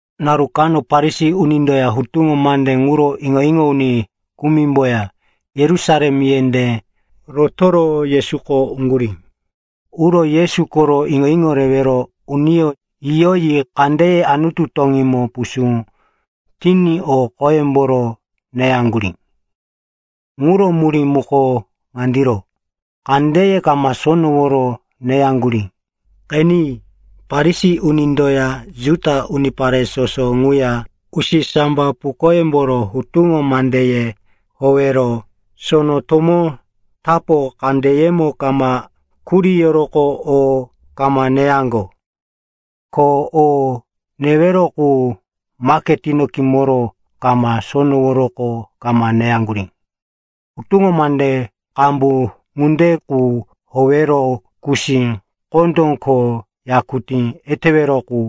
Naru kano Farisi unindoya hutuŋo mande ŋuro iŋo-iŋo uni kumimboya Yerusalem yendé rotoro Yesuko uŋgurí. Uro Yesu koro iŋo-iŋo rewero uniyó yiyoyi kandeye Anutu toŋímo pusú tiní o qoyemboro neyaŋgurí. (Ŋuro murí muko ŋandiro, kandeye kama sonoworo neyaŋgurí.) Qeni, Farisi unindoya Juda unipare soso ŋuya usisambapukoyemboro hutuŋo mandeye howero sono tomó tapo kandeyemo kama kuriyoroqo o kama neyaŋgo. Ko o newero qu maketino kimoro kama sonoworoqo kama neyaŋgurí. Hutuŋo mande qambu ŋunde qu howero kusí, kondó ko yakutí etewero qu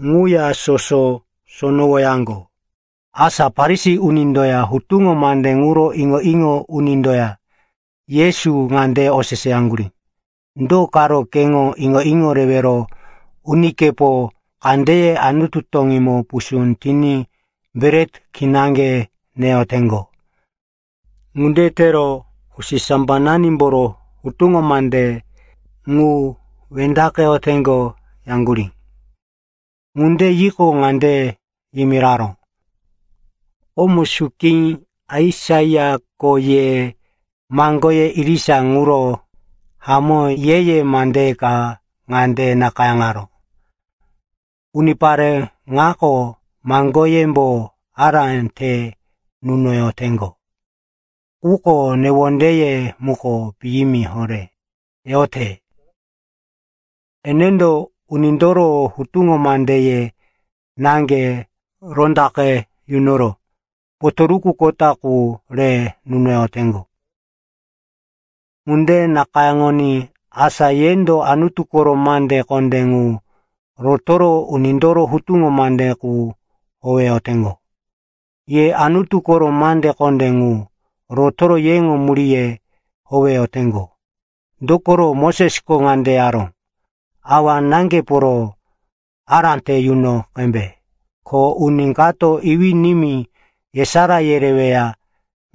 ŋuya soso sonowoyaŋgo. Asa Farisi unindoya hutuŋo mande ŋuro iŋo-iŋo unindoya Yesu ŋande oseseyaŋgurí, “Do karo keŋo iŋo-iŋo rewero unikepo kandeye Anutu toŋímo pusú tiní bret kinaŋge neyoteŋgo? Ŋunde tero usisambananimboro hutuŋo mandeye ŋu wendaqeyoteŋgo,” yaŋgurí. Ŋunde yiqo, ŋande yimiraró, “Komo suki Aisaiako ye maŋgoye irisa ŋuro hamó ye-ye mande ka ŋande nakayáŋaró, “‘Unipare ŋako maŋgoyembo ará te nunoyoteŋgo, quko newondeye muko piyimi horé teyote. Enendo unindoro hutuŋo mandeye naŋge rondaqe yunoro potoruku kota qu re nunoyoteŋgo.’ Ŋunde nakayáŋoní asa yendo Anutu koro mande kondé ŋu rotoro unindoro hutuŋo mande qu howeyoteŋgo. “Ye Anutu koro mande kondé ŋu rotoro yeŋo muríye howeyoteŋgo. Dokoro Mosesko ŋande yaró, ‘Awa-náŋgeporo ará te yuno qembe,’ ko, ‘Uni kato iwí-nimí yesará yereweya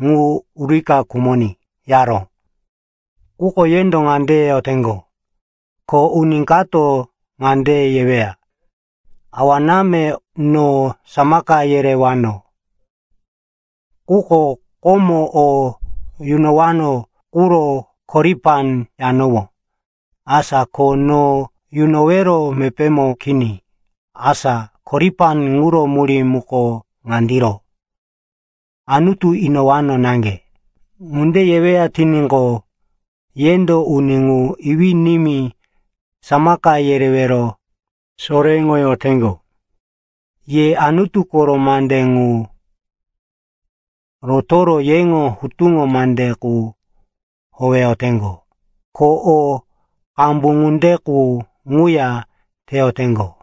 ŋu urika khumoní,’ yaró. Quko yendo ŋande yeyoteŋgo, ko uni kato ŋande yeweya, ‘Awa-náme, no samaka yerewano, quko komo o yunowano quro “Koripan” yanowó. Asa ko no yunowero mepémo kini.’ (Asa “Koripan” ŋuro murí muko ŋandiro, “Anutu inowano naŋge.”) Ŋunde yeweya tiníqo, yendo uni ŋu iwí-nimí samaka yerewero soréŋoyoteŋgo. Ye Anutu koro mande ŋu rotoro yeŋo hutuŋo mande qu howeyoteŋgo. Ko o qambu ŋunde qu ŋuya teyoteŋgo.”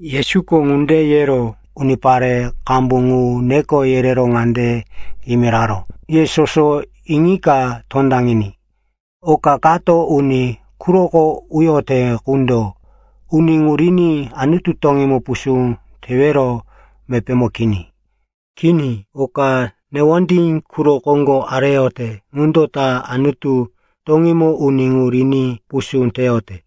Yesuko ŋunde yero unipare qambu ŋu neko yerero ŋande yimiraró, “Ye soso iŋika tondaŋiní. Oka kato uni quroko uyote qundo uni ŋu riní Anutu toŋímo pusú tewero mepémo kini. Kini. Oka newondí quro koŋgo areyote ŋundo ta Anutu toŋímo uni ŋu riní pusú teyote.”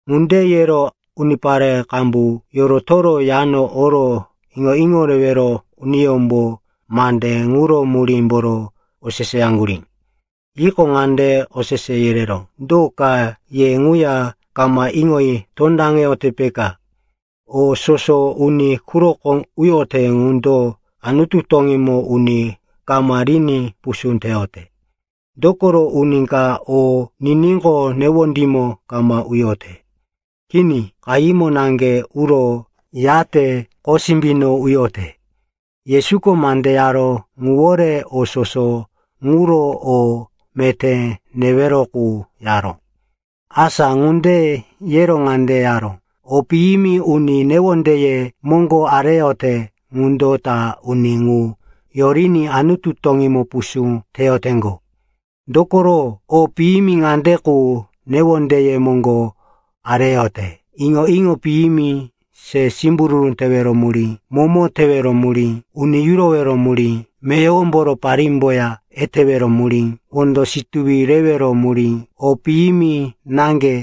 Ŋunde yero unipare qambu yorotoro yano oro iŋo-iŋo rewero uniyómbo mande ŋuro murímboro oseseyaŋgurí. Yiqo, ŋande osese yereró, “Do ka? Ye ŋuya kama iŋoyi tondaŋeyote, peka? O soso uni quroko uyote ŋundo Anutu toŋímo uni kama riní pusú teyote. Dokoro uni ka o niníqo, newondímo kama uyote. Kini. Qahímo naŋge uro, yate qosimbino uyote.” (Yesuko mande yaró ŋuwore o soso ŋuro, “O meté newero qu,” yaró.) Asa ŋunde yero ŋande yaró, “O piyimi uni newondeye moŋgo areyote ŋundo ta uni ŋu yoriní Anutu toŋímo pusú teyoteŋgo. Dokoro o piyimi ŋande qu newondeye moŋgo areyote: iŋo-iŋo piyimi, se simbururu tewero murí, momo tewero murí, uni yurowero murí, meyowomboro parímboya etewero murí, wondo situwi rewero murí, o piyimi naŋge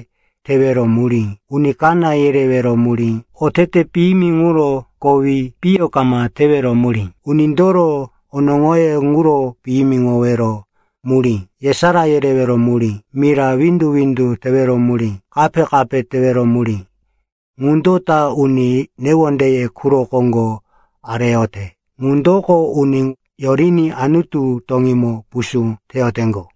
tewero murí, uni kaná yerewero murí, otete piyimi ŋuro kowi piyo kama tewero murí, unindoro onoŋoyó ŋuro piyimiŋowero murí, yesará yerewero murí, mira windu-windu tewero murí, kape-kape tewero murí. Ŋundo ta uni newondeye quro koŋgo areyote ŋundoko uni ŋu yoriní Anutu toŋímo pusú teyoteŋgo.”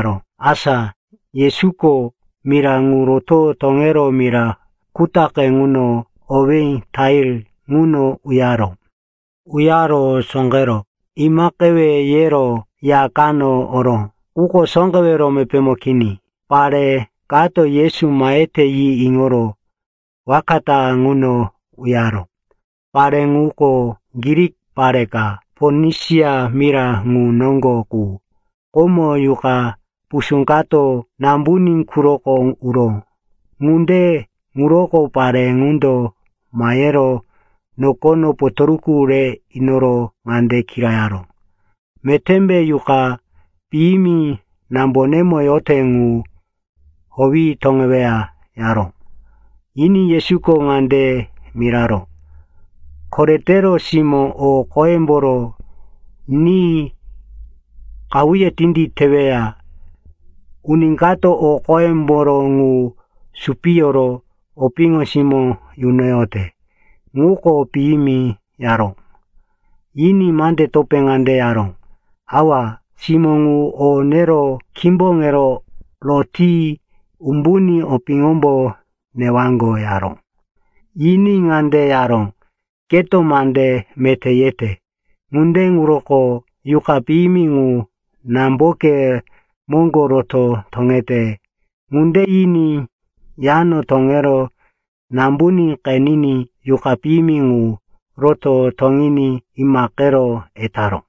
Asa Yesuko mira ŋu roto toŋero mira kutaqe ŋu, owí Tair, ŋuno uyaró. Uyaro sóqero imaqewe yero ya kano oró. Quko sóqewero mepémo kini. Pare kato Yesu mahete yi iŋoro waka ta ŋuno uyaró. Pare ŋuko Grik pare ka, Ponisia mira ŋu noŋgo qu. Komo, yuqa pusú kato nambuní quroko uró. Ŋunde ŋuroko pare ŋundo mahero nokono potoruku re inoro ŋande kirayaró, “Metémbe yuqa piyimi nambonemo yote ŋu howi toŋeweya?” yaró. Yiní Yesuko ŋande miraró, “Koretero simó o qoyemboro ni qahuye tinditeweya. Uni kato o qoyemboro ŋu supiyoro opiŋo simó yunoyote, ŋuko piyimi,” yaró. Yiní mande topé ŋande yaró, “Awa, simó ŋu o nero kimboŋero roti umbuní opiŋombo newaŋgo,” yaró. Yiní ŋande yaró, “Keto mande meté yete. Ŋunde ŋuroko yuqa piyimi ŋu namboke moŋgo roto toŋete.” Ŋunde yiní yano toŋero nambuní qeniní yuqa piyimi ŋu roto toŋiní imaqero etaró.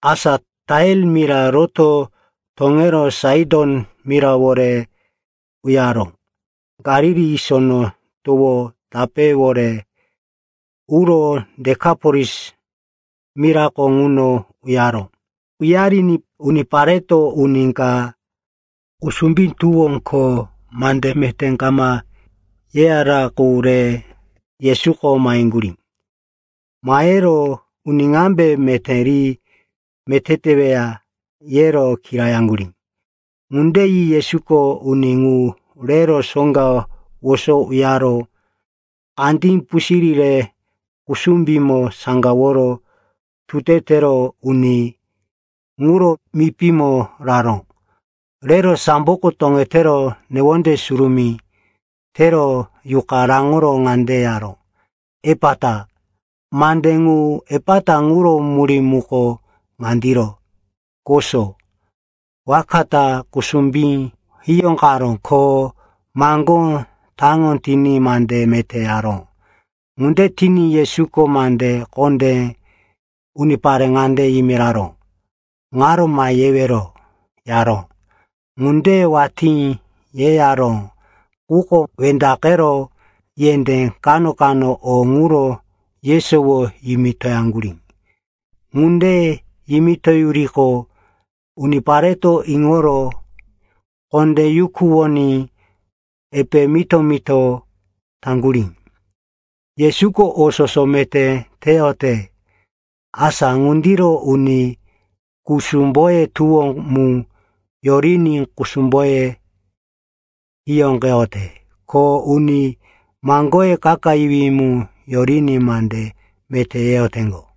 Asa Tair mira roto toŋero Saiton mirawore uyaro Galili Sono Towo tapéwore uro Dekapolis mirako ŋuno uyaro. Uyariní unipareto uni ka kusumbí tuwo ko mande meté kama yeyara qu re Yesuko maheŋgurí. Mahero, “Uni ŋambe meté ri meté teweya?” yero kirayaŋgurí. Ŋunde yi Yesuko uni ŋu rero soŋga woso uyaro kandí pusirí re kusumbímo saŋgaworo, tute tero, uni ŋuro mipímo raró. Rero samboko toŋetero newonde surumí tero yuqa raŋoro ŋande yaró, “Epata.” (Mande ŋu, “Epata,” ŋuro murí muko ŋandiro, “Koso.”) Waka ta kusumbí hiyóqaró. Ko maŋgó taŋo tiní mande meté yaró. Ŋunde tiní Yesuko mande kondé unipare ŋande yimiraró, “Ŋaro ma yewero,” yaró. Ŋunde watí yeyaró, quko wendaqero yendé kano-kano o ŋuro yesowo yimitoyaŋgurí. Ŋunde yimitoyuriqo, unipareto iŋoro kondé yukuwoní epe mito-mito taŋgurí, “Yesuko o soso meté teyote. Asa ŋundiro uni kusumboye tuwo mu yoriní kusumboye hiyóqeyote. Ko uni maŋgoye kakayiwí mu yoriní mande meté yeyoteŋgo.”